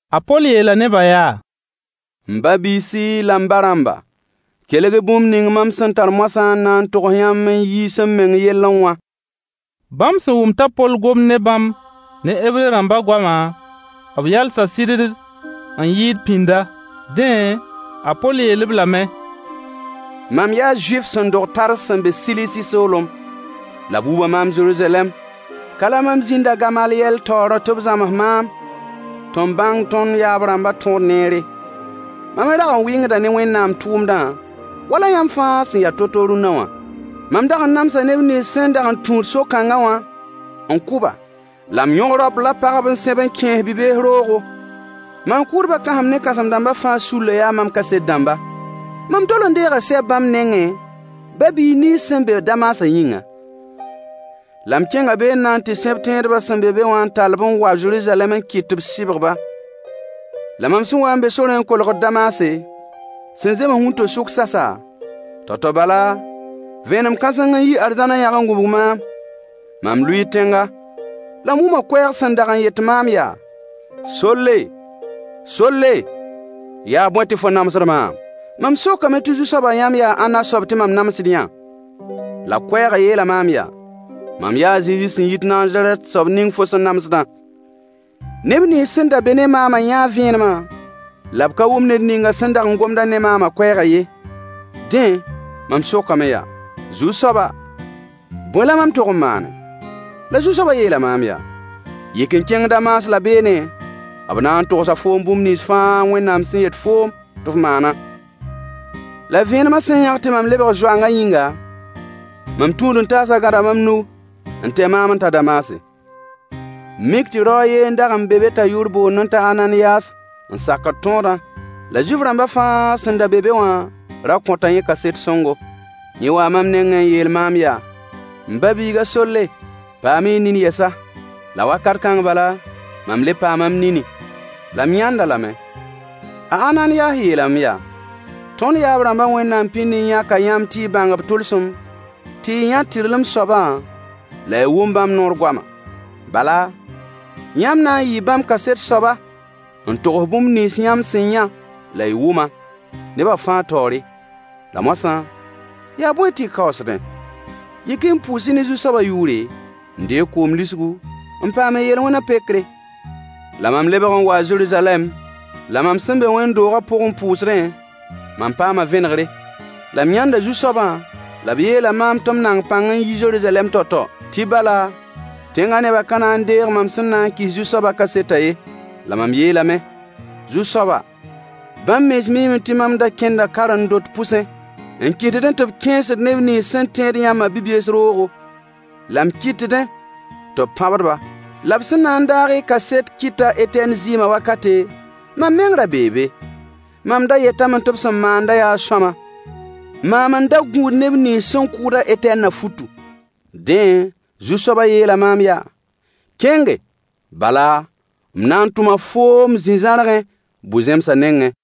A Poll yeela nebã yaa: M ba-biisi la m ba-rãmba, kelg-y bũmb ning mam sẽn tar moasã n na n togs yãmb n yiis m meng yellẽ wã. Bãmb sẽn wʋm t'a Poll gomd ne bãmb ne Hebre rãmba goama, b yalsa sɩddd n yɩɩd pĩnda. Dẽ, a Poll yeel-b lame. Mam yaa Zuif sẽn dog Tars sẽn be Silisi soolem. La b wuba maam Zeruzalɛm ka la mam zĩnda a Gamalyɛl taoor tɩ b zãms maam tɩ m bãng tõnd yaab-rãmbã tõod neere. Mam me rag n wɩngda ne Wẽnnaam tʋʋmdã wala yãmb fãa sẽn ya to-to rũnna wã. Mam dag n namsa neb nins sẽn dag n tũud so-kãnga wã n kʋ-ba, la m yõg raop la pagb n sẽb n kẽes-b bi-bees roogo. Maan-kʋʋdbã kãsem ne kãsem-dãmbã fãa sullã yaa mam kaset dãmba. Mam tol n deega sɛb bãmb nengẽ, ba-biis nins sẽn be Damasã yĩnga, la m kẽnga be n na n tɩ sẽb tẽedba sẽn be be wã n tall-b n wa Zeruzalɛm n kɩt tɩ b sɩbg-ba. La mam sẽn waa n be sorẽ n kolgd Damase, sẽn zems wĩnto-sʋk sasa, tao-tao bala, vẽenem kãseng n yi arzãn n yãg n gũbg maam. Mam lʋɩɩ tẽnga, la m wʋma koɛɛg sẽn dag n yet maam yaa: “Solle! Solle! Yaa bõe tɩ fo namsd maam?” Mam sokame tɩ Zu-soaba yãmb yaa ãnna soab tɩ mam namsd-yã? La koɛɛgã yeela maam yaa: “Mam yaa a Zezi sẽn yit Nazarɛt, soab ning fo sẽn namsdã.” Neb nins sẽn da be ne maama yãa vẽenemã, la b ka wʋm ned ninga sẽn da gomd-a ne maama koɛɛgã ye. Dẽ, mam sokame yaa: “Zu-soaba, bõe la mam tog n maane?” La Zu-soabã yeela maam yaa: “Yik n kẽng Damas la beene, b na n togsa foom bũmb nins fãa Wẽnnaam sẽn yet foo tɩ f maana.” La vẽenemã sẽn yãg tɩ mam lebg zoangã yĩnga, mam tũud-n-taasã gãda mam nug n tae maam n ta Damase. Mik tɩ rao a yen n dag n be be t'a yʋʋr boondẽ t'a Ananiyas n sakd tõodã, la Zuif-rãmba fãa sẽn da be be wã ra kõta yẽ kaset sõngo. Yẽ waa mam nengẽ n yeel maam yaa: “M ba-biig a Solle, paam-y nin yɛsa.” La wakat kãng bala, mam le paama m nini, la m yãnd-a lame. A Ananiyas yeelame yaa: “Tõnd yaab-rãmba Wẽnnaam pĩnd n yãka yãmb tɩ y bãng b tʋlsem, tɩ y yã tɩrlem soabã la y wʋm bãmb noor goama. Bala, yãmb na n yɩɩ bãmb kaset soaba n togs bũmb nins yãmb sẽn yã la y wʋmã, neba fãa taoore. La moasã, yaa bõe tɩ y kaoosdẽ? Yik-y n pʋʋs-y ne Zu-soabã yʋʋre, n deeg koom lisgu, n paam y yel-wẽna pekre.” La mam lebg n waa Zeruzalɛm, la mam sẽn be wẽnd-doogã pʋg n pʋʋsdẽ, mam paama vẽnegre. La m yãnda Zu-soabã, la b yeela maam tɩ m nang-pãng n yi Zeruzalɛm tao-tao, tɩ bala, tẽngã nebã ka na n deeg mam sẽn na n kɩs Zu-soaba kasetã ye. La mam yeelame: “Zu-soaba, bãmb mens miime tɩ mam da kẽnda karen-dot pʋsẽ, n kɩtdẽ tɩ b kẽesd neb nins sẽn tẽed yãmbã bi-bees roogo, la m kɩtdẽ tɩ b pãbd-ba. La b sẽn na n daag y kaset kɩt a Etɛn zɩɩmã wakate, mam meng ra bee be, mam da yetame tɩ b sẽn maanda yaa sõama, maam n da gũud neb nins sẽn kʋʋd a Etɛnna futu.” Dẽ, Zu-soabã yeela maam yaa: “Kẽnge, bala, m na n tʋma foom zĩ-zãrgẽ, bu-zẽmsã nengẽ.”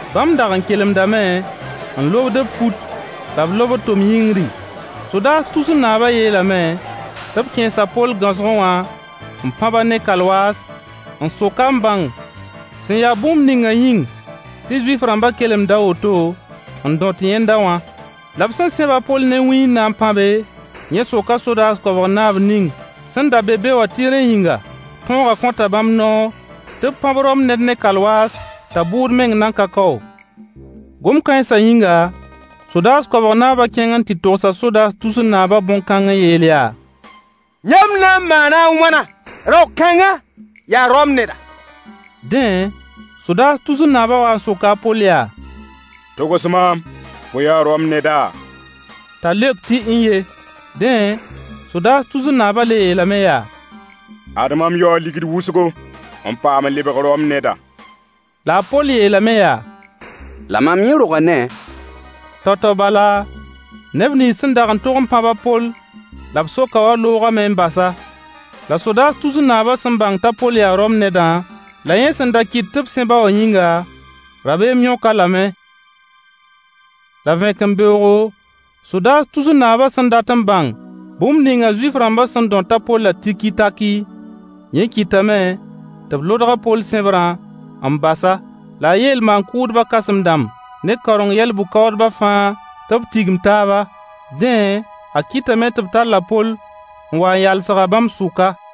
Bãmb dag n kelemdame, n lobd b fut la b lobd tom yĩngri. Sodaas tusr naabã yeelame tɩ b kẽes a Poll gãosgẽ wã n pãb-a ne kalwaas n sok-a n bãng sẽn ya bũmb ninga yĩng tɩ Zuif-rãmba kelemd a woto n dõt yẽnda wã. La b sẽn sẽb a Poll ne wĩy n na n pãbe, yẽ soka sodaas koabg naab ning sẽn da be be wã tɩ rẽ yĩnga, tõogã kõta bãmb noor tɩ b pãb Rom ned ne kalwaas t'a bʋʋd meng nan ka kao? Gom-kãensa yĩnga, sodaas koabg naaba kẽng n tɩ togsa sodaas tusr naabã bõn-kãng n yeel yaa: Yãmb na n maana a wãna? Rao-kãngã, yaa Rom neda. Dẽ, sodaas tusr naabã wa n soka a Poll yaa: Togs maam, fo yaa Rom neda? T'a leok tɩ n-ye. Dẽ, sodaas tusr naabã le yeelame yaa: Ad mam yaoo ligd wʋsgo, n paam lebg Rom neda. La a Poll yeelame yaa: La mam yẽ roga ne-a. Tao-tao bala, neb nins sẽn dag n tog n pãb a Poll la b sok-a wã loogame n bas-a. La sodaas tusr naabã sẽn bãng t'a Poll yaa Rom nedã, la yẽ sẽn da kɩt tɩ b sẽb-a wã yĩnga, rabeem yõk-a lame. La vẽkembeoogo, sodaas tusr naabã sẽn dat n bãng bũmb ninga Zuif-rãmba sẽn dõt a Pollã tiki-takɩ, yẽ kɩtame tɩ b lodg a Poll sẽbrã n bas-a. La a yeel maan-kʋʋdbã kãsem-dãmb ne kaoreng yɛl-bʋ-kaoodbã fãa tɩ b tigim taaba. Dẽ, a kɩtame tɩ b talla a Poll n wa n yalsg-a bãmb sʋka.